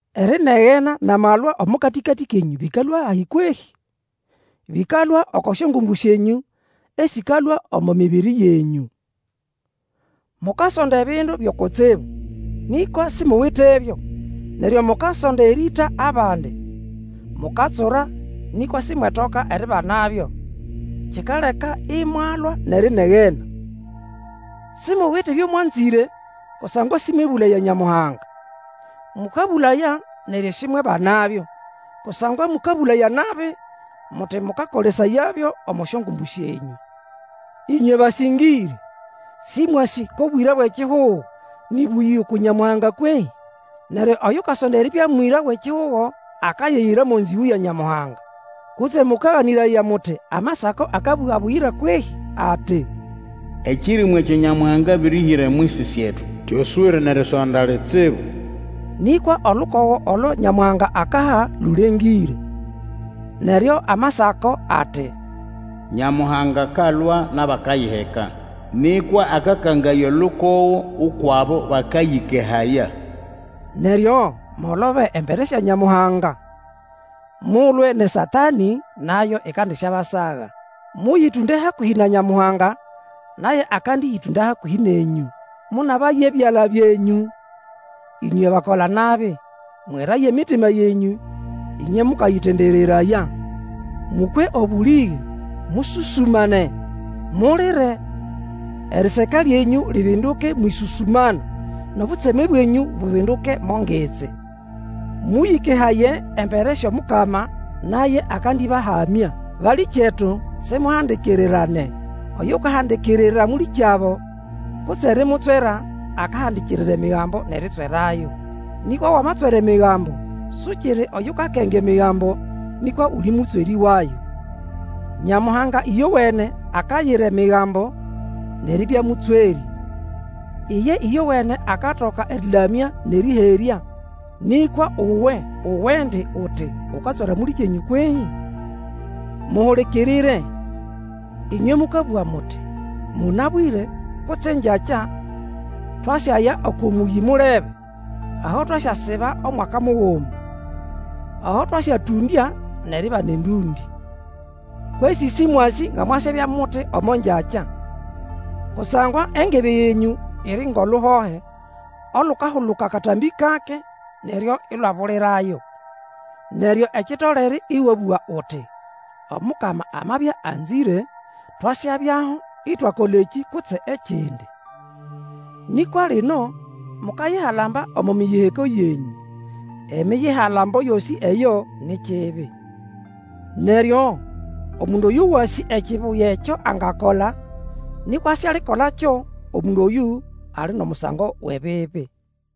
Erinegena nʼamalwa omo katĩkatĩ kenyũ bĩkalũa hahi kwehĩ? Bĩkalũa oko syongumbu syenyũ esĩkalũa omo mibiri yenyũ. Mukasonda ebindu byo kutsibu, nĩkwa simuwitebyo, neryo mukasonda erĩĩta abandi. Mukatsura nĩkwa simwetoka eribanabyo; kikaleka imwalwa nʼerinegena. Simuwite ebyo mwanzĩre kusangwa sĩmwebũlaya Nyamuhanga. Mũkabũlaya neryo simwebanabyo, kusangwa mũkabũlaya nabi, muti mũkakolesayabyo omo syongumbu syenyũ. Ĩnywe basĩngĩrĩ, sĩmwasĩ ko bwĩra bwʼekihugo nĩ bũyĩgũ uku Nyamuhanga kwehĩ? Neryo Oyukasonda eribya mwĩra wʼekihugo akayiyira mo nzĩgũ ya Nyamuhanga. Kutse mũkaganĩraya muti Amasako akabũga buyira kwehĩ, ati, Ekĩrĩmũ ekyo Nyamuhanga abĩrĩhĩra omwisi syetu, kyoswĩre nʼerisonda litsibu. Nĩkwa olukogo olo Nyamuhanga akaha lũlengĩre. Neryo Amasako ati, Nyamuhanga akalwa nʼabakayiheka, nĩkwa akakangaya olukogo ukwʼabo bakayĩkehaya. Neryo mwolobe embere sya Nyamuhanga. Mulwe nʼeSatanĩ, nayo ikandisyabasaga. Mũyĩtũnde hakũhĩ na Nyamuhanga, naye akandĩyĩtũnda hakũhĩ nenyũ. Mũnabaye ebyala byenyũ, ĩnywe bakola-nabi! Mweraye emitima yenyũ ĩnywe mũkayĩtendereraya. Mũkwe obũlĩge, mũsũsũmane, mulire: eriseka lyenyũ libinduke mwʼĩsũsũmana, nʼobutseme bwenyũ bubinduke mo ngitsi. Mũyĩkehaye embere syʼOmukama, naye akandĩbahamya. Balĩkyetu, simuhandikirirane. Oyukahandikirira mũlĩkyabo, kutse erimutswera, akahandikirira Emigambo nʼeritswerayo. Nĩkwa Wamatswera Emigambo, sukiri oyukakenga Emigambo, nĩkwa uli mũtswerĩ wayo. Nyamuhanga ĩyowene akayira Emigambo nʼeribya mũtswerĩ. Iye ĩyowene akatoka erĩlamya nʼerĩherya, nĩkwa uwe uwendi uti ukatswera mũlĩkyenyũ kwehĩ? Muhulikirire, ĩnywe mũkabũga muti, Mũnabwĩre kutse engyakya, twasyaya oko mũyĩ mulebe, aho twasyasiba Omwaka muguma. Aho twasyatũndya, nʼeribana endũndĩ. Kwesĩ sĩmwasĩ nga mwasyabya muti omo ngyakya. Kusangwa engebe yenyũ iri ngʼoluhohe, olukahuluka katambĩ kake, neryo ilwabulirayo. Neryo ekitolere ĩwabũga uti, Omukama amabya anzĩre, twasyabyaho itwakola ekĩ kutse ekindi. Nĩkwa lino, mukayihalamba omo miyiheko yenyũ. Emiyihalambo yosĩ eyo ni kibi. Neryo, omundu oyo wasĩ ekibuya ekyo angakola, nĩkwa sialikolakyo, omundu oyũ ali mʼomusango wʼebibi.